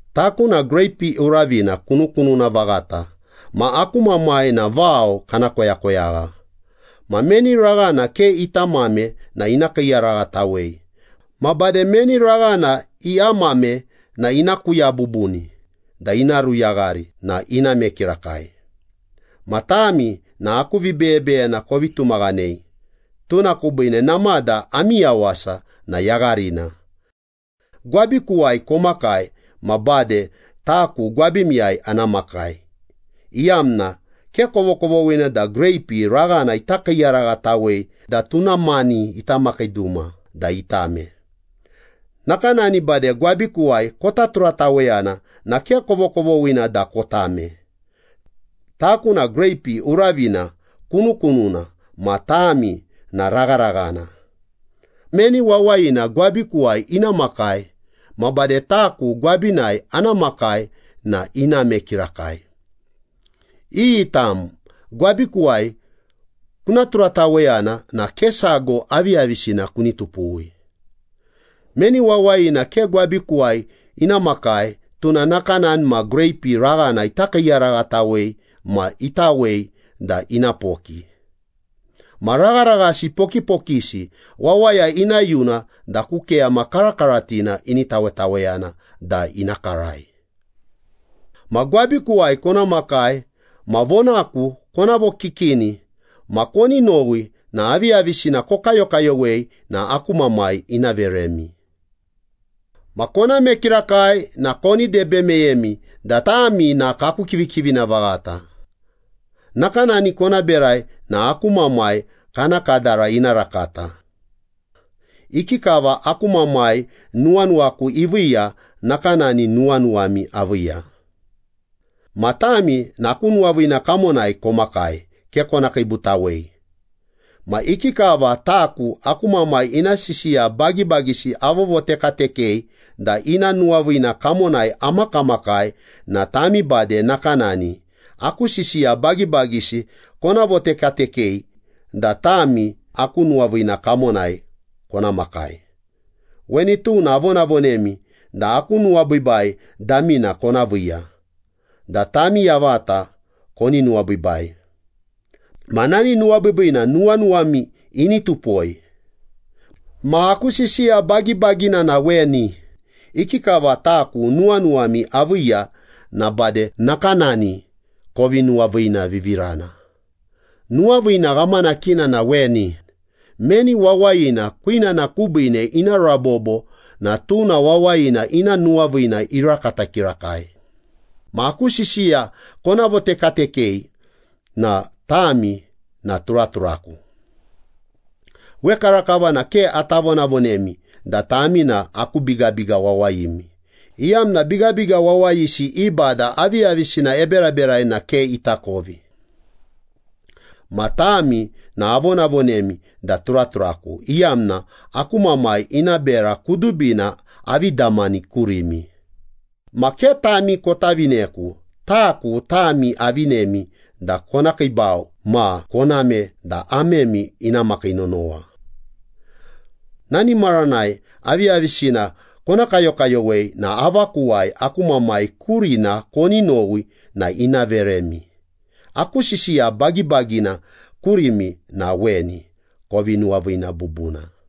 “Taku na greipi uravina kunukununa vaghata ma aku Mamai na vao kana koyakoyagha. Ma meni raghana ke ita amame na ina kiiyaraghatawei. Ma bade meni raghana iamame na ina kuya bubuni da ina ruyaghari na iname kirakai. Ma tami na aku vibeyebeyena kovi tumaghanei, tuna kubiine namada ami yawasa na yagharina. Gwabikuwai komakai ma bade taku gwabimiyai ana makai, iyamna ke kovokovoghina da greipi raghana ita kiiyaraghatawei da tuna mani ita makii duma da itame. Nakanani bade gwabikuwai kota turataweyana na ke kovokovoghina da kotame.” “Taku na greipi uravina kunukununa ma tami na ragharaghana. Meni wawayina gwabikuwai ina makai, ma bade taku gwabinai ana makai na iname kirakai. Iyi tam gwabikuwai kuna turataweyana na ke sago aviyavisina kuni tupuwi. Meni wawayina ke gwabikuwai ina makai, tuna nakanani ma greipi raghana ikiiyaraghatawei ma itawei da ina poki. Ma ragharaghasi pokipokisi wawaya ina yuna da ku keyama karakaratina ini tawetaweyana da ina karai. Ma gwabikuwai kona makai ma vonaku kona vokikini ma koni nowi na aviyavisina kokayokayowei na aku Mamai ina veremi. Ma koname kirakai na koni debe meyemi da tami na kaku kivikivina vaghata. Nakanani kona berai na aku Mamai kana kadara ina rakata. Ikikava aku Mamai nuwanuwaku iviiya, nakanani nuwanuwami aviiya. Ma tami na aku nuwaviina kamonai komakai, ke kona kiibutawei. Ma ikikava taku aku Mamai ina sisiya bagibagisi avovotekatekei da ina nuwaviina kamonai amakamakai na tami bade nakanani, aku sisiya bagibagisi kona votekatekei da tami aku nuwaviina kamonai kona makai.” “Weni tuna avonavonemi da aku nuwabiibai damina kona viiya, da tami yavata koni nuwabiibai. Ma nani nuwabiibiina nuwanuwami ini tupoi. Ma aku sisiya bagibagina na weni, ikikava taku nuwanuwami aviiya na bade nakanani kovi nuwaviinavivirana. Nuwaviina ghamanakina na weni, meni wawayina kwinana kubiine ina rabobo na tuna wawayina ina nuwaviina irakata kirakai. Ma aku sisiya kona votekatekei na tami na turaturaku. Wekarakava na ke ata vonavonemi da tami na aku bigabiga wawayimi, iyamna bigabiga wawayisi i bada aviyavisina eberaberai na ke itakovi. Ma tami na avonavonemi da turaturaku, iyamna aku Mamai ina bera kudubina avi damani kurimi. Ma ke tami kota vineku, taku tami avinemi da kona kiibau ma koname da amemi ina makii nonowa. Nani maranai aviyavisina kona kayokayowei na avakuwai aku Mamai kurina koni nowi na ina veremi. Aku sisiya bagibagina kurimi na weni, kovi nuwaviina bubuna.”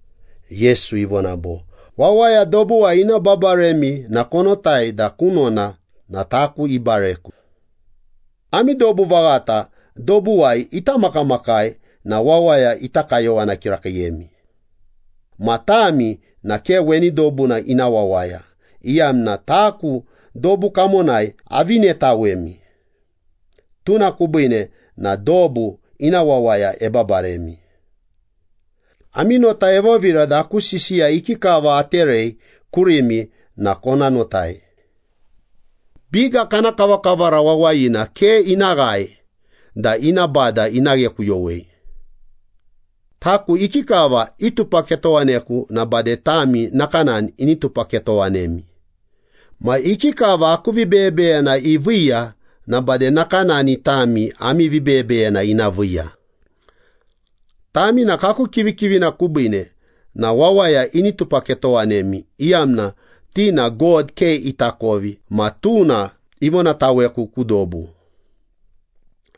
Yesu ivona bo, “Wawaya dobuwai ina babaremi na konotai da kunona na taku ikiibareku. Ami dobu vaghata dobuwai ita makamakai na wawaya ita kayowana kirakiiyemi. Ma tami na ke weni dobuna ina wawaya, iyamna taku dobu kamonai avinetawemi. Tuna kubiine na dobu ina wawaya ebabaremi. Ami nota evovira da aku sisiya ikikava aterei kurimi na kona notai. ‘Biga kana kavakavara wawayina ke ina ghae da ina bada ina ghekuyowei.’ Taku ikikava itupaketowaneku na bade tami nakanani ini tupaketowanemi. Ma ikikava aku vibeyebeyena iviiya na bade nakanani tami ami vibeyebeyena ina viiya. Tami na kaku kivikivina kubiine na wawaya ini tupaketowanemi, iyamna ti na God ke itakovi ma tuna ivonataweku ku dobu.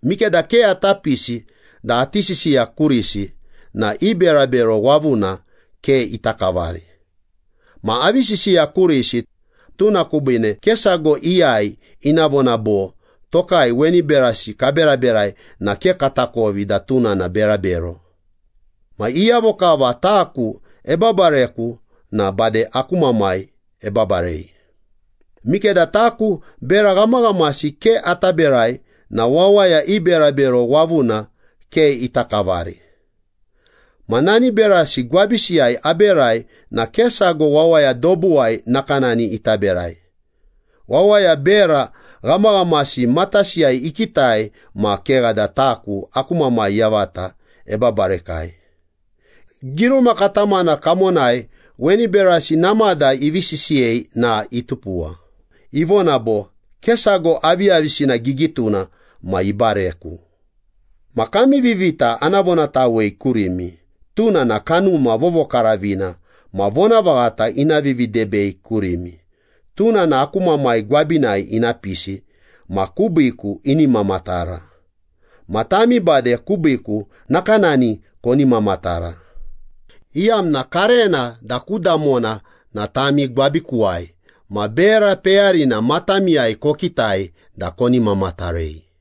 Mikeda ke ata pisi da ati sisiya kurisi na i berabero wavuna ke ita kavari. Ma avi sisiya kurisi, tuna kubiine ke sago iyai ina vona bo, ‘Tokai weni berasi kaberaberai na ke katakovi da tuna na berabero.’ Ma iyavo kava taku ebabareku na bade aku Mamai ebabarei. Mikeda taku bera ghamaghamasi ke ata berai na wawaya i berabero wavuna ke ita kavari. Ma nani berasi gwabisiyai aberai na ke sago wawaya dobuwai nakanani ita berai. Wawaya bera ghamaghamasi matasiyai ikitai ma kegha da taku aku Mamai yavata ebabarekai. Giruma katamana kamonai weni berasi namada ivi sisiyei na itupuwa. Ivona bo, ‘Ke sago aviyavisina gigituna ma ibareku.’” “Ma kami Vivita na ana vonatawei kurimi. Tuna na Kanuma Vovokaravina ma vonavaghata ina vividebei kurimi. Tuna na aku Mamai gwabinai ina pisi ma kubiiku ini mamatara. Ma tami bade kubiiku nakanani koni mamatara, iyamna karena da ku damona na tami gwabikuwai ma bera peyarina matamiyai kokitai da koni mamatarei.”